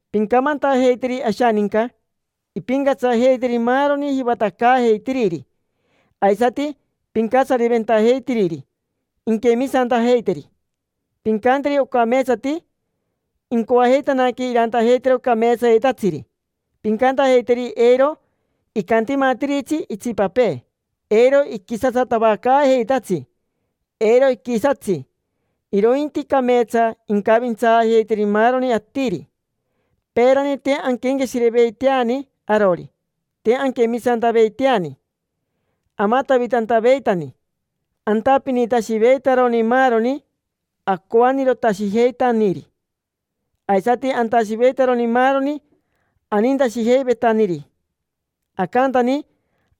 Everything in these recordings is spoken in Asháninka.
Pincamantajeiteri ashaninca impincatsajeiteri maaroni jivatacaajeitiriri aisati pincatsariventajeitiriri, inquemisantajeiteri. Pincanteri ocameetsati incoajeitanaque irantajeitero cameetsayetatsiri. Pincantajeiteri eiro icantimatiritsi itsipapee, eiro iquisatsatavacaajeitatsi, eiro iquisatsi, irointi cameetsa incavintsaajeiteri maaroni atiri. Peerani te anquenqueshireveiteani arori, te anquemisantaveiteani, amatavitantaveitani, antapinitashiveitaroni maaroni acoanirotashijeitaniri, aisati antashiveitaroni maaroni anintashijeivetaniri. Acantani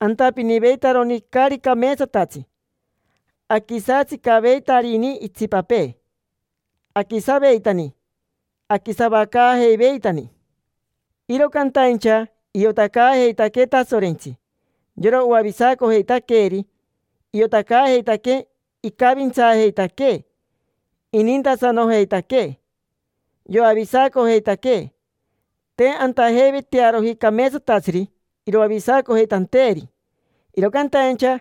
antapiniveitaroni caari cameetsatatsi, aquisatsicaveitarini itsipapee, aquisaveitani, aquisavacaajeiveitani. Iro cantaincha iotacaajeitaquee Tasorentsi, yora oavisacojeitaqueeri. Iotacaajeitaquee icavintsaajeitaquee, inintasanojeitaquee. Yoavisacojeitaquee. Te antajeivetearoji cameetsatatsiri iroavisacojeitanteeri, iro cantaincha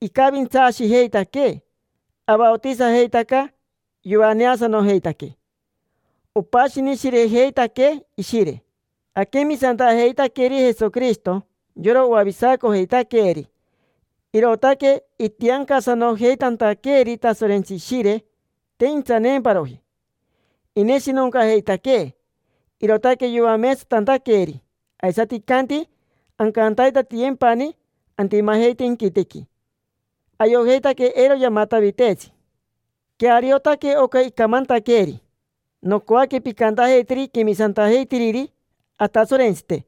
icavintsaashijeitaquee. Avaotisajeitaca, yoaneasanojeitaquee, opashinishirejeitaquee Ishire. Aquemisantajeitaqueri Jesoquirishito, yora oavisacojeitaqueeri, irootaque itiancasanojeitantaqueeri Tasorentsi Ishire, te intsaneemparoji. Ineshinoncajeitaquee, irootaque yoameetsatantaqueeri, aisati icanti ancantaitatiyempani antimajeite inquitequi. Ayojeitaque eiro yamataviteetsi. Queariotaque oca icamantaqueeri. Nocoaque pincantajeiteri quemisantajeitiriri Atasorentsite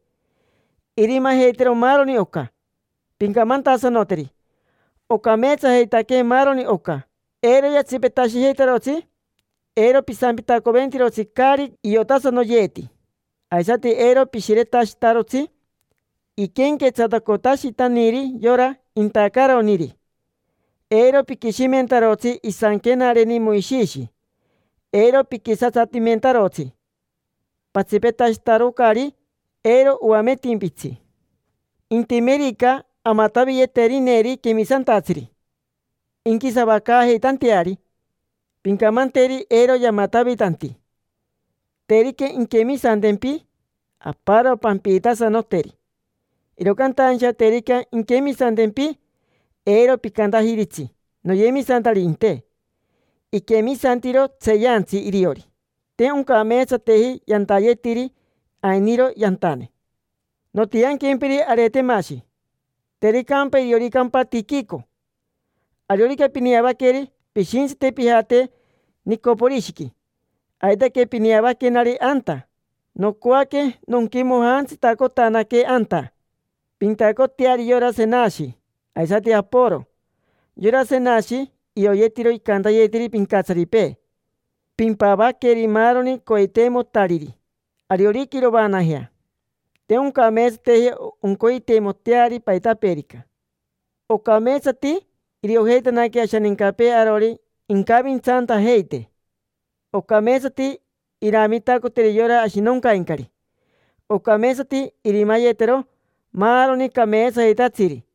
irimajeitero maaroni oca, pincamantasanoteri. Ocameetsajeitaque maaroni oca: eiro yatsipetashijeitarotsi. Eiro pisampitacoventirotsi caari iotasanoyeeti, aisati eiro pishiretashitarotsi iquenquetsatacotashitaniri yora intacaroniri. Eiro piquishimentarotsi isanquenareni Moishishi, eiro piquisatsatimentarotsi. Patsipetashitarocari, eiro oametimpitsi. Intimerica amataviyeterineri quemisantatsiri inquisavacaajeitanteari, pincamanteri eiro yamatavitanti. Terica inquemisantempi, aparo pampiitasanoteri. Iro cantaincha terica inquemisantempi, eiro picantajiritsi: “Noyemisantaririnte”. Iquemisantiro tseeyantsi iriori. Te oncameetsateji yantayetiri, ainiro yantane. Nontianquempiri Aretemashi; tericampa, irioricampa Tiquico. Ariorica pineavaqueri, pishintsite pijate Nicoporishiqui: aitaque pineavaquenari anta. Nocoaque nonquimojantsitacotanaque anta. Pintacoteari yora Senashi, aisati Aporo. Yora Senashi ioyetiro icantayetiri pincatsaripee. Pimpavaqueri maaroni coiteimotariri ariorica irovaanajea. Te oncameetsateji oncoiteimoteari paitapeerica. Ocameetsati iriojeitanaque ashanincapee arori incavintsaantajeite. Ocameetsati iramitacoteri yora ashinoncaincari. Ocameetsati irimayetero maaroni cameetsayetatsiri.